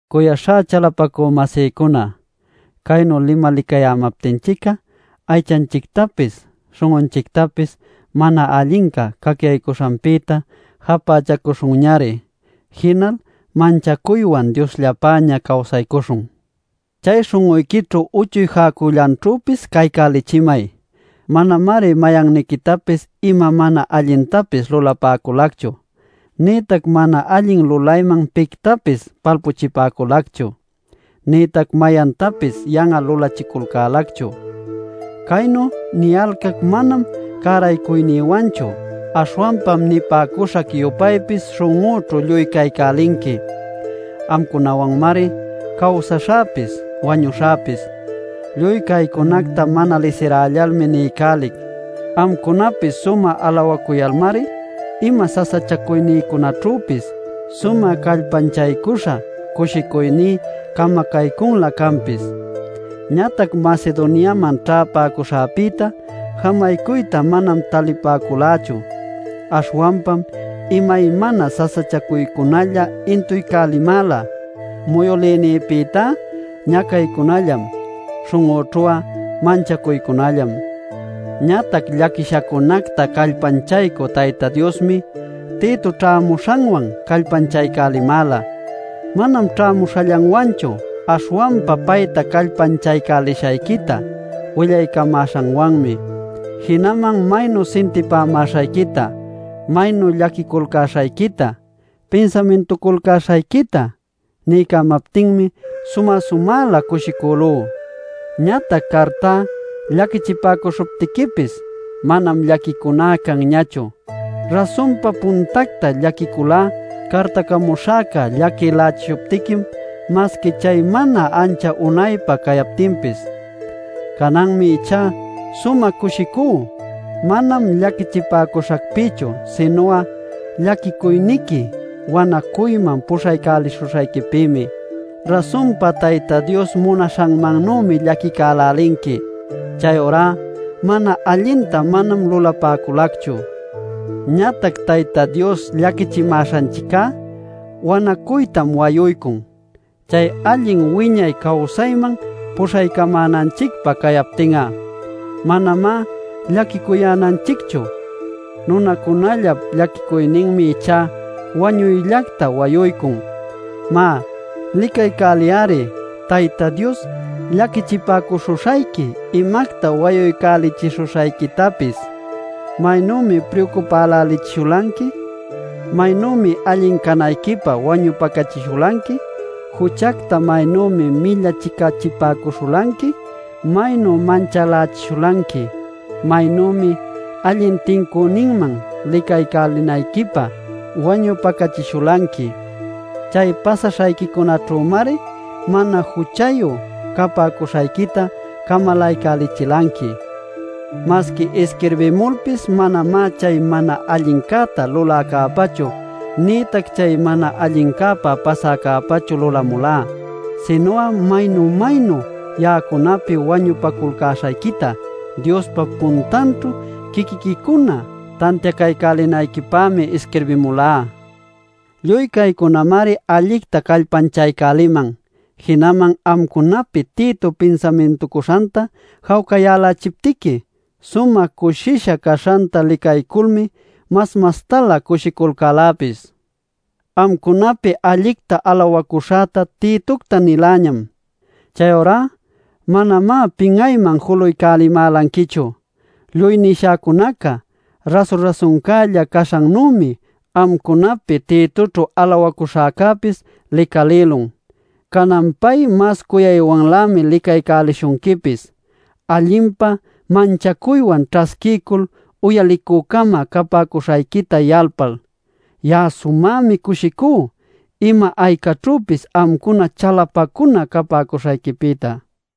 Cuyaśhá chalapacü-masïcuna, caynu limalicayämaptinchic'a aychanchictapis śhun'unchictapis mana allinca cacyaycuśhancäpïta japächacuśhunñari. Jinal manchacuywan Diosllapäña cawsaycuśhun. Chay śhun'uyquićhu uchuy jäcullanćhüpis caycälichimay. Manamari mayanniquitapis ima mana allintapis lulapäculacchu, nïtac mana allin lulayman pictapis palpuchipäculacchu, nïtac mayantapis yan'al lulachiculcälächu. Caynu niyalcac manam cäraycuynïwanchu. Aśhwanpam nipäcuśhac-yupaypis śhun'üćhu lluy caycälinqui; amcunawanmari cawsaśhäpis, wañuśhäpis. Lluy caycunacta mana lisiräyalmi niycälic. Amcunapi sumä alawacuyalmari ima sasachacuynïcunaćhüpis sumä callpanchaycuśha cushicuyní camacaycülä canpis. Ñatac Macedoniaman ćhäpäcuśhäpïta jamaycuyta manam talipäculächu. Aśhwanpam imaymana sasachacuycunalla intuycälimäla: muyülïnïpïtá ñacaycunallam, śhun'üćhu'a manchacuycunallam. Ñatac llaquishacunacta callpanchaycü Tayta Diosmi Tito ćhämuśhanwan callpanchaycälimäla. Manam ćhämuśhallanwanchu, aśhwanpa payta callpanchaycälishayquita willaycamäśhanwanmi. Jinaman maynu sintipämäśhayquita, maynu llaquiculcäśhayquita, pinsamintuculcäśhayquita niycamaptinmi sumä-sumälä cushicülú. Ñatac cartá llaquilächishuptiquipis manam llaquicuná canñachu. Rasunpa puntacta llaquiculá, cartacamuśhäca llaquilächishuptiquim masqui chay mana ancha unaypa cayaptinpis. Cananmi ichá sumä cushicú; manam llaquichipäcuśhacpïchu sinu'a llaquicuyniqui wanacuyman puśhaycälishuśhayquipïmi. Rasunpa, Tayta Dios munaśhanmannümi llaquicälälinqui; chayurá mana allinta manam lulapäculacchu. Ñatac Tayta Dios llaquichimäśhanchic'a wanacuytam wayuycun. Chay allin wiñay cawsayman puśhaycamänanchicpä cayaptin'a manamá llaquicuyänanchicchu. Nunacunallap llaquicuyninmi ichá wañuyllacta wayuycun. Má, licacaycäliy-ari Tayta Dios llaquichipäcuśhuśhayqui imacta wayuycälichishuśhayquitapis: ¡maynümi priucupälälichishulanqui, maynümi allin canayquipä wañupacachishulanqui, juchacta maynümi millachicachipäcuśhulanqui, maynu manchälächishulanqui, maynümi allin tincüninman licaycälinayquipä wañupacachishulanqui! Chay pasaśhayquicunaćhümari mana juchayu capäcuśhayquita camalaycälichilanqui. Masqui isquirbimulpis manamá chay mana allincäta luläcäpächu, nïtac chay mana allincäpa pasäcäpächu lulamulá. Sinu'a maynu-maynu ya'acunapi wañupaculcäśhayquita Diospa puntanćhu quiquiquicuna tantiacaycälinayquipämi isquirbimulá. Lluy caycunamari allicta callpanchaycäliman. Jinaman amcunapi Tito pinsamintucuśhanta jawcayälächiptiqui, sumä cushisha caśhanta licayculmi mas mastalä cushiculcäläpis. Amcunapi allicta alawacuśhäta Titocta niläñam. Chayurá ¡manamá pin'ayman julaycälimälanquichu! Lluy nishäcunaca rasu-rasuncälla caśhannümi, amcunapi Titoćhu alawacuśhäcäpis licalïlun. Canan pay mas cuyaywanlämi licaycälishunquipis, allinpa manchacuywan ćhasquiycul uyalicü-cama capäcuśhayquita yalpal. Ya'a sumämi cushicú ima aycaćhüpis amcuna chalapacuna capäcuśhayquipïta.